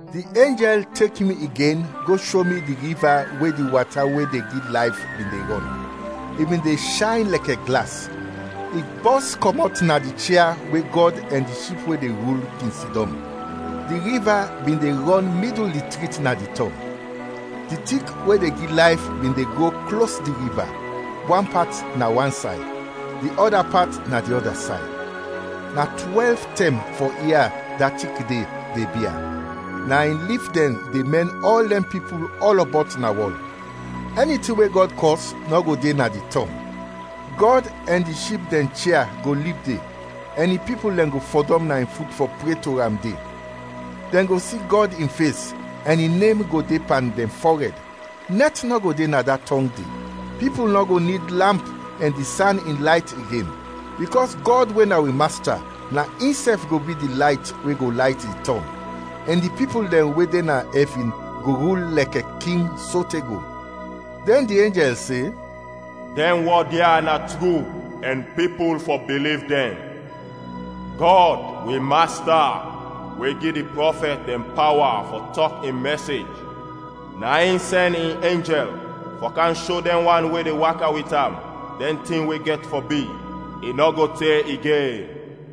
Di enjɛl tek mi igen go sho mi di riva we di wata we de gi layf bin de rɔn, i bin de shayn lɛkɛ glas. I bɔs kɔmɔt na di chia we Gɔd ɛn di Ship we de rul, kin sidɔm. Di riva bin de rɔn midul di trit na di tɔng. Di tik we de gi layf bin de gro klos di riva, wan pat na wansay, di ɔda pat na di ɔda say. Na twɛlv tɛm fɔ ia da tik de, de bia; na in lif dɛn de mɛn ɔl dɛn pipul ɔlɔbɔt na wɔl. Ɛni tin we Gɔd kɔs nɔ go de na di tɔng. Gɔd ɛn di Ship dɛn chia go lib de, ɛn in pipul dɛn go fɔdɔm na in fut fɔ pre to am de. Dɛn go si Gɔd in fes, ɛn in nem go de pan dɛn fɔrɛd. Nɛt nɔ go de na da tɔng de; pipul nɔ go nid lamp ɛn di san in layt igen, bikɔs Gɔd we na wi Masta na insɛf go bi di layt we go layt di tɔng. Ɛn di pipul dɛn we de na ɛvin go rul lɛkɛ king sote go. Dɛn di enjɛl se, “Dɛn wɔd ya na tru ɛn pipul fɔ biliv dɛn. Gɔd, wi Masta, we gi di prɔfɛt dɛn pawa fɔ tɔk in mɛsej, na in sɛn in enjɛl fɔ kam sho dɛn wan we de waka wit am dɛn tin we gɛt fɔ bi, i nɔ go te igen.”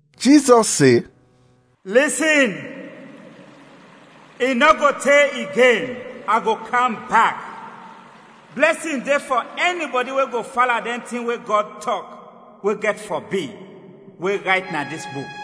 Jizɔs se, “Lisin, i nɔ go te igen, a go kam bak! Blɛsin de fɔ ɛnibɔdi we go fala dɛn tin we Gɔd tɔk, we gɛt fɔ bi, we rayt na dis buk.”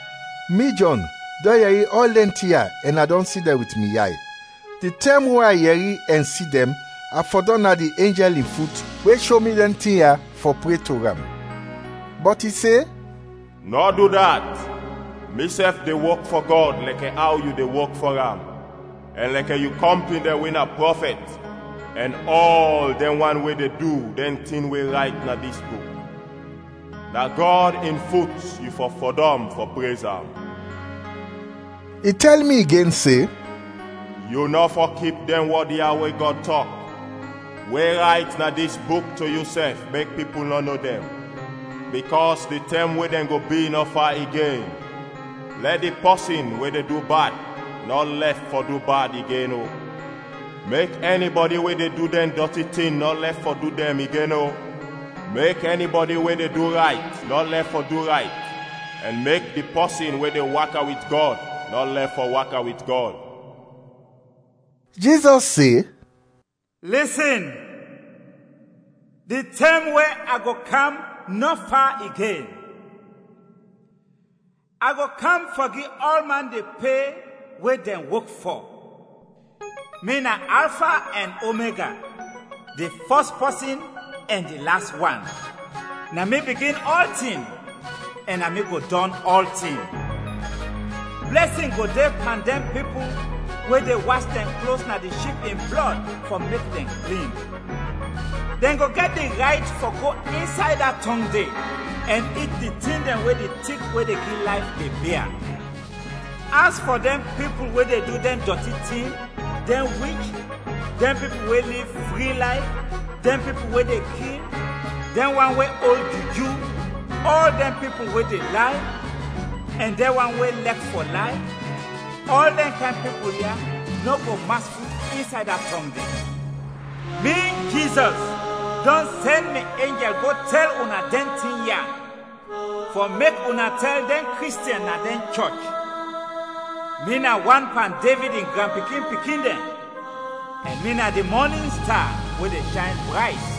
Mi Jɔn, dɔn yɛri ɔl dɛn tin ya ɛn a dɔn si dɛn wit mi yay. Di tɛm we a yɛri ɛn si dɛn, a fɔdɔm na di enjɛl in fut we sho mi dɛn tin ya, fɔ pre to am. Bɔt i se, “Nɔ du dat! Misɛf de wok fɔ Gɔd lɛkɛ aw yu de wok fɔ am, ɛn lɛkɛ yu kɔmpin dɛn we na prɔfɛt ɛn ɔl dɛn wan we de du dɛn tin we rayt na dis buk. Na Gɔd in fut yu fɔ fɔdɔm fɔ prez am!” I tɛl mi igen se, “Yu nɔ fɔ kip dɛn wɔd ya we Gɔd tɔk, we rayt na dis buk to yusɛf mek pipul nɔ no dɛn, bikɔs di tɛm we dɛn go bi nɔ fa igen. Lɛ di pɔsin we de du bad nɔ lɛf fɔ du bad igen o, mek ɛnibɔdi we de du dɛn dɔti tin nɔ lɛf fɔ du dɛn igen o, mek ɛnibɔdi we de du rayt nɔ lɛf fɔ du rayt, ɛn mek di pɔsin we de waka wit Gɔd nɔ lɛf fɔ waka wit Gɔd.” Jizɔs se, “Lisin, di tɛm we a go kam nɔ fa igen. A go kam fɔ gi ɔlman di pe we dɛn wok fɔ. Mi na Alfa ɛn Omega, di fɔs pɔsin ɛn di las wan; na mi bigin ɔltin ɛn na mi go dɔn ɔltin.” Blɛsin go de pan dɛn pipul we de was dɛn klos na di Ship in blɔd fɔ mek dɛn klin. Dɛn go gɛt di rayt fɔ go insay da tɔng de ɛn it di tin dɛn we di tik we de gi layf, de bia. As fɔ dɛn pipul we de du dɛn dɔti tin, dɛn wich, dɛn pipul we liv fri layf dɛn pipul we de kil, dɛn wan we ol juju, ɔl dɛn pipul we de lay, ɛn dɛn wan we lɛk fɔ lay, ɔl dɛn kayn pipul ya nɔ go mas fut insay da tɔng de. “Mi, Jizɔs dɔn sɛn mi enjɛl go tɛl una dɛn tin ya fɔ mek una tɛl dɛn Kristiɛn na dɛn chɔch. Mi na wan pan Devid in granpikin-pikin dɛn ɛn mi na di mɔnin sta we de shayn brayt.”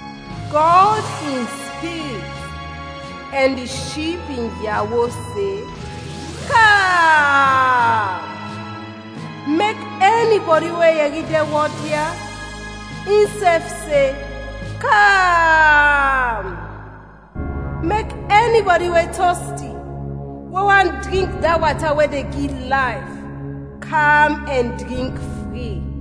Gɔd in Spirit ɛn di Ship in yawo se, “Kam!” Mek ɛnibɔdi we yɛri dɛn wɔd ya, insɛf se, “Kam!” Mek ɛnibɔdi we tɔsti, we want drink da wata we de gi layf, kam ɛn drink fri.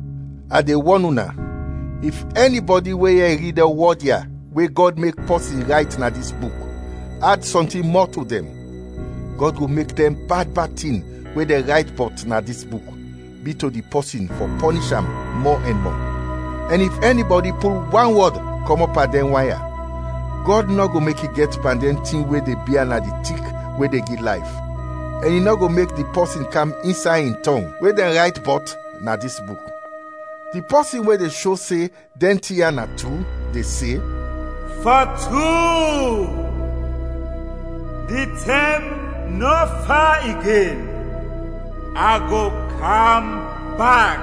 A de wɔn una, if ɛnibɔdi we yɛri dɛn wɔd ya we Gɔd mek pɔsin rayt na dis buk, ad sɔntin mɔ to dɛn, Gɔd go mek dɛn bad bad tin we dɛn rayt bɔt na dis buk, bi to di pɔsin fɔ pɔnish am mɔ ɛn mɔ. Ɛn if ɛnibɔdi pul wan wɔd kɔmɔt pan dɛn wan ya, Gɔd nɔ go mek i gɛt pan dɛn tin we de bia na di tik we de gi layf, ɛn i nɔ go mek di pɔsin kam insay in tɔng, we dɛn rayt bɔt na dis buk. Di pɔsin we de sho se dɛn tin ya na tru, de se, “Fɔ tru, di tɛm nɔ fa igen. A go kam bak!”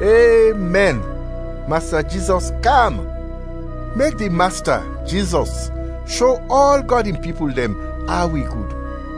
Emɛn. Masta Jizɔs, kam! Mek di Masta, Jizɔs sho ɔl Gɔd in pipul dɛn aw i gud.